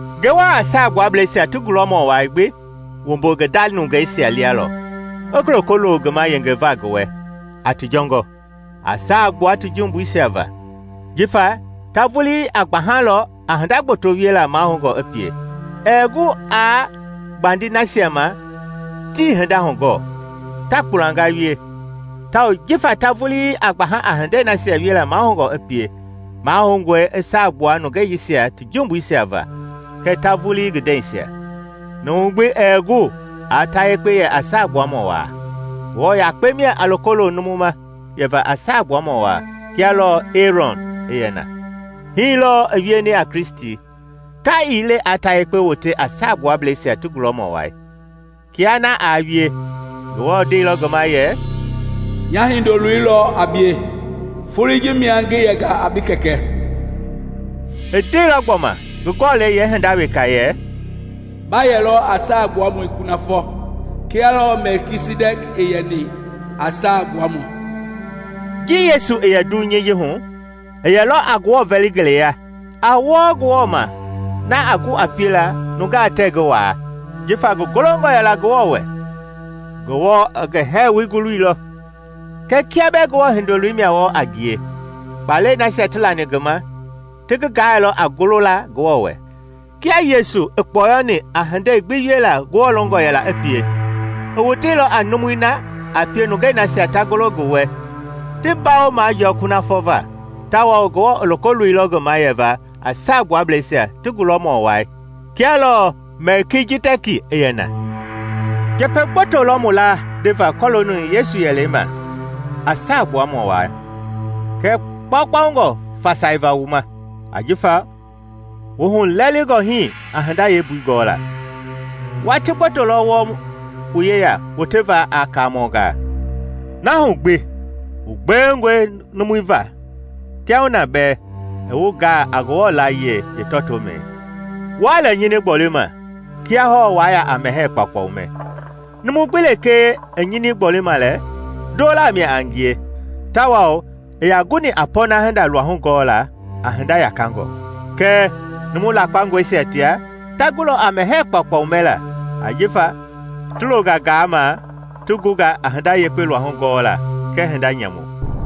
Ngewɔ a Saagbuablɛisia ti gulɔmɔ wai gbi wumbu ngi nda nungeisia lia lɔ, i loko lo ngi ma yengeva ngi wɛ a ti jɔngɔ, a saa gbua ti jumbuisia va. Jifa ta vulii a gbahalɔ a hinda gboto wiela mahoungɔ i pie, ɛɛ gu aa gbandi nasia ma tii hinda hugɔɔ, ta kpulanga wie. Tawao jifa ta vulii a gbaha a hindei nasia wiela mahoungɔ i pie, mahoungɔe i saagbua nungeisia ti jumbuisia va kɛɛ ta vulii ngi ndɛisia. Numu gbi ɛɛ gu aa ta yekpe yɛ a Saagbuamɔ Waa. Ngewɔ yakpe mia a loko lo numu ma yɛva a saagbuamɔ waa kia lɔɔ Ɛerɔn i yɛ na. Hii lɔɔ i wieni a Kristi; ta ii le aa ta yekpe wote a Saagbuablɛisia ti gulɔmɔ wai. Kia na aa wie, Ngewɔ ndeilɔ ngi ma yɛ, “Nya Hindoloi lɔ a bie; folei ji mia ngi yɛnga a bi Kɛkɛ.” I ndeilɔ gbɔma ngi Gɔlɛi yeehinda weka yɛ, “Ba yɛlɔ a Saagbuamɔ kunafɔ, kia lɔɔ Mɛlkijidɛki i yɛni a Saagbuamɔ.” Ji Yesu i yɛ ndɛvu hu dunyei ji hu, i yɛlɔ a Ngewɔ vɛli ngele ya, a wɔɔ Ngewɔ ma na a gu a piela nungaa tɛɛ ngi waa. Jifa ngi golongɔ yɛla Ngewɔ wɛ, Ngewɔ i ngi hɛɛwoi guluilɔ. Kɛɛ kia bɛɛ Ngewɔ Hindoloi mia wɔɔ a ngie, kpaalɛi nasia ti lani ngi ma ti ngi gaailɔ a golola Ngewɔ wɛ. Kia Yesu i kpɔyɔni a hindei gbi wiela Ngewɔ longɔ yɛla i pie, i woteilɔ a numui na a pie nungei nasia ta golo ngi wɛ ti mbawo majɔɔ kunafɔ va, tawao Ngewɔ i loko loilɔ ngi ma yɛva a Saagbuablɛisia ti gulɔmɔ wai kia lɔɔ Mɛlkijidɛki i yɛ na. Njɛpɛ gboto lɔ mu laa ndeva kɔlooni Yesu yɛlɛi ma a Saagbuamɔ Waa, kɛɛ kpaukpaungɔe fasaiva wu ma, ajifa wu hulɛlɛngɔ hii a hinda yeembui gɔla. Watii gboto lɔ wɔɔ wu yeya woteva a kaamɔngaa, na hu gbi wu gbewengɔe numu va kiahuna bee i wu gaa a Ngewɔ laayiɛi yeetɔtoomɛi. Wuaa lɛ nyini gbolima kia hɔɔ waa ya a mɛhɛɛ kpaukpau mɛ. Numu gbi lekee i nyini gbɔlima lɛ, ndolaa mia a ngie tawao ii yaa guni a pɔɔna hinda luahu gɔla a hinda yakangɔ. Kɛɛ numu lakpangɔisia tia, ta gulɔ a mɛhɛɛ kpaukpau mɛla ajifa ti longa gaama ti gunga a hinda yekpe luahu gɔla kɛɛ hinda nyamu.